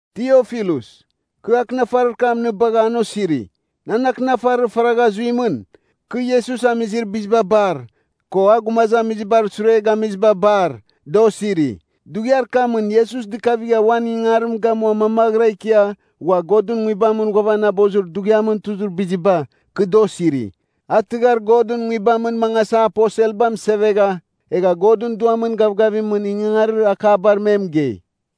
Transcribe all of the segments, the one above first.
Tiofilus, kɨ akɨnafarir kam nɨ bagha an osiri. Nan akɨnafarir faragha zuimɨn, kɨ Iesus amizir biziba bar, ko a gumazamizibar sure gamiziba bar, da osiri. Dughiar kamɨn Iesus dɨkavigha uan ingangarim gamua mamaghɨra ikia, ghua a Godɨn Nguibamɨn ghuavanabozir dughiamɨn tuzir biziba, kɨ da osiri. A tɨghar Godɨn Nguibamɨn mangasa, aposelba mɨsevegha egha Godɨn Duamɨn gavgavimɨn ingangarir akabar me mɨgei.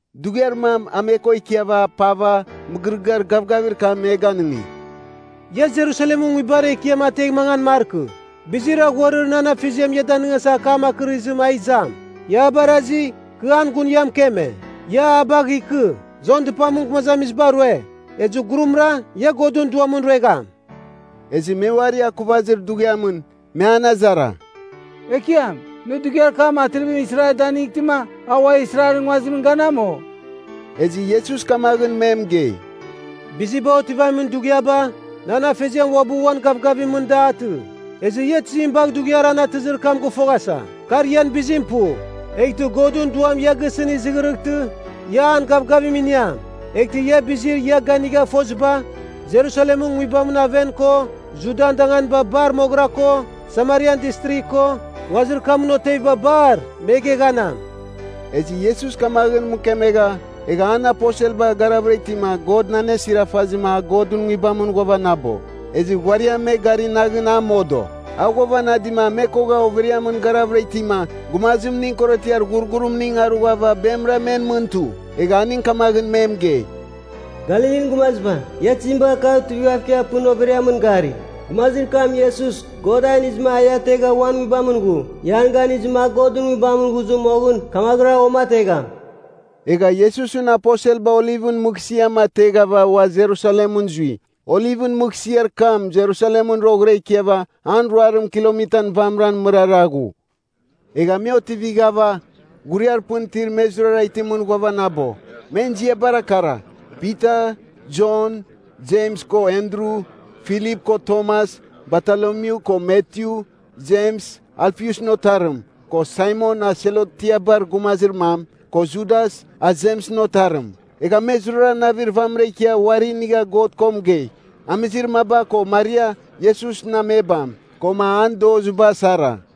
Dughiar mam a me ko ikiava, apava mɨgɨrɨgɨar gavgavir kam me ganɨngi, “Ia Jerusalemɨn nguibar ekiam ategh mangan markɨ. Bizir aghuarir nan Afeziam ia danɨngasa akam akɨrizim a izam. Ia a barazi, kɨ an gun ia mɨkeme. Ia a bagh ikɨ. Jon dɨpamɨn gumazamiziba rue, ezɨ gurumra ia Godɨn Duamɨn ruegham.” Ezɨ me uari akuvazir dughiamɨn, me an azara, “Ekiam, nɨ dughiar kam atrivim Israel danightɨma, a ua Israelɨn nguazimɨn ganam, o?” Ezɨ Iesus kamaghɨn me mɨgei, “Biziba otivamin dughiaba, nan afeziam uabɨ uan gavgavimɨn da atɨ. Ezɨ ia tizim bagh dughiar an atɨzir kam gɨfoghasa. Kar ian bizim pu. Eghtɨ Godɨn Duam ia gisɨn izɨghɨrɨghtɨ, ia an gavgavim iniam; eghtɨ ia bizir ia ganigha foziba, Jerusalemɨn nguibamɨn aven ko, Judian danganiba bar moghɨra ko, Samarian Distrigh ko, nguazir kamɨn oteviba bar, me geghanam.” Ezɨ Iesus kamaghɨn mɨkemegha, egha an aposelba garavɨra itima God anesiarafazɨma a Godɨn Nguibamɨn ghuavanabo. Ezɨ ghuariam me gari naghɨn a modo. A ghuavanadima me kogha overiamɨn garavɨra itima, gumazimning korotiar ghurghurimning arughava bemɨra men mɨn tu. Egha aning kamaghɨn me mɨgei, “Galilin gumaziba, ia tizim bagha kagh tuivighav ikia pɨn overiamɨn gari? Gumazir kam Iesus, God a inizɨma a ia ategha uan Nguibamɨn ghu. Ia an ganizɨma a Godɨn Nguibamɨn ghuzɨ moghɨn, kamaghɨra a uamategham.” Egha Iesusɨn aposelba Olivɨn Mɨghsɨam ateghava ua Jerusalemɨn zui. Olivɨn Mɨghsɨar kam Jerusalemɨn roghɨra ikiava an ruarim kilomitan vamɨran mɨrara ghu. Egha me otivighava, ghuriar pɨn itir me zurara itimɨn ghuavanabo. Men ziabara kara: Pita, Jon, Jems ko Andru, Filip ko Tomas, Batolomyu ko Matyu, Jems, Alfiusɨn otarim, ko Saimon a Selotiabar gumazir mam, ko Judas, a Jemsɨn otarim. Egha me zurara navir vamɨra ikia uari inigha God ko mɨgei, amizir maba ko Maria, Iesusɨn amebam, koma an doziba sara.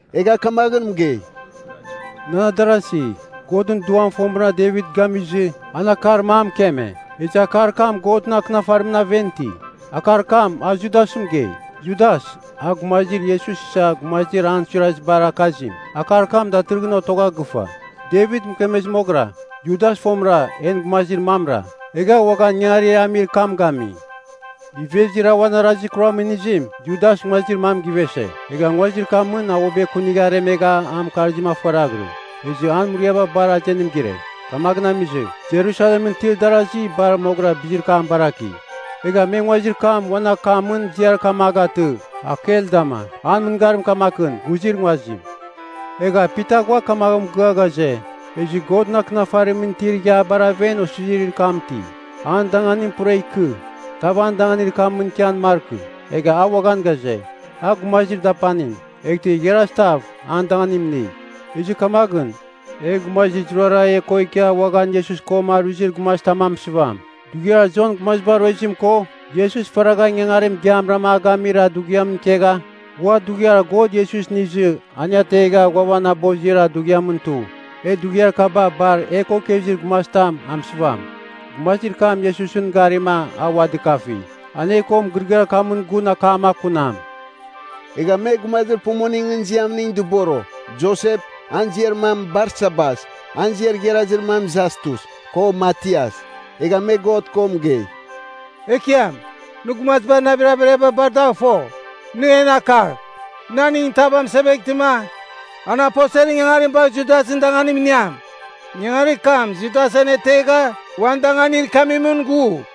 egha kamaghɨn mɨgei, “Nan adarasi, Godɨn Duam fomɨra Devit gamizɨ, an akar mam mɨkeme. Ezɨ akar kam Godɨn Akɨnafarimɨn aven iti. Akar kam a Judasɨn mɨgei. Judas, a gumazir Iesus isa gumazir an suirazibar akazim. Akar kam datɨrɨghɨn otogha gɨfa, Devit mɨkemezir moghɨra. Judas fomɨra en gumazir mamra, egha uaghan ingangarir e amir kam gami.” (Ivezir a uan arazir kuramɨn inizim, Judas nguazir mam givese. Egha nguazir kamɨn a uabɨ ekunigha aremegha an mɨkarzim afoaraghɨrɨ, ezɨ an muriaba bar azenim gire. Kamaghɨn amizɨ, Jerusalemɨn itir darasi bar moghɨra bizir kam baraki, egha me nguazir kam uan akamɨn ziar kam a gatɨ, Akeldama. An mɨngarim kamaghɨn, ghuzir nguazim.) Egha Pita ghua kamaghɨn mɨgɨa ghaze, “Ezɨ Godɨn Akɨnafarimɨn itir Ighiabar aven osizirir kam iti, ‘An danganim pura ikɨ, tav an danganir kamɨn ikian markɨ.’ Egha a uaghan ghaze, ‘A gumazir dapanim, eghtɨ igharaz tav an danganim ini.’ “Ezɨ kamaghɨn, e gumazir zurara e ko ikia uaghan Iesus ko aruizir gumazitam a mɨsɨvam. Dughiar Jon gumaziba ruezim ko Iesus faragha ingangarim igiamra a gamir dughiam ikegha, ghua dughiar God Iesus inizɨ an e ategha ghuavanabozir dughiamɨn tu. E dughiar kaba bar e ko ikezir gumazitam a mɨsɨvam. Gumazir kam Iesusɨn garima, a ua dɨkafi. An e ko mɨgɨrɨgɨar kamɨn gun akam akunam.” Egha me gumazir pumuningɨn ziamning dɨboro, Josep, an ziar mam Barsabas (an ziar igharazir mam Jastus) ko Matias. Egha me God ko mɨgei, “Ekiam, nɨ gumazibar navir averiaba bar dagh fo. Nɨ en akagh, nɨ aningɨn tav amɨseveghtɨma, an aposelɨn ingangarim bagh Judasɨn dangamin iniam. Ingangarir kam Judas anetegha uan danganir ikiamimɨn ghu.”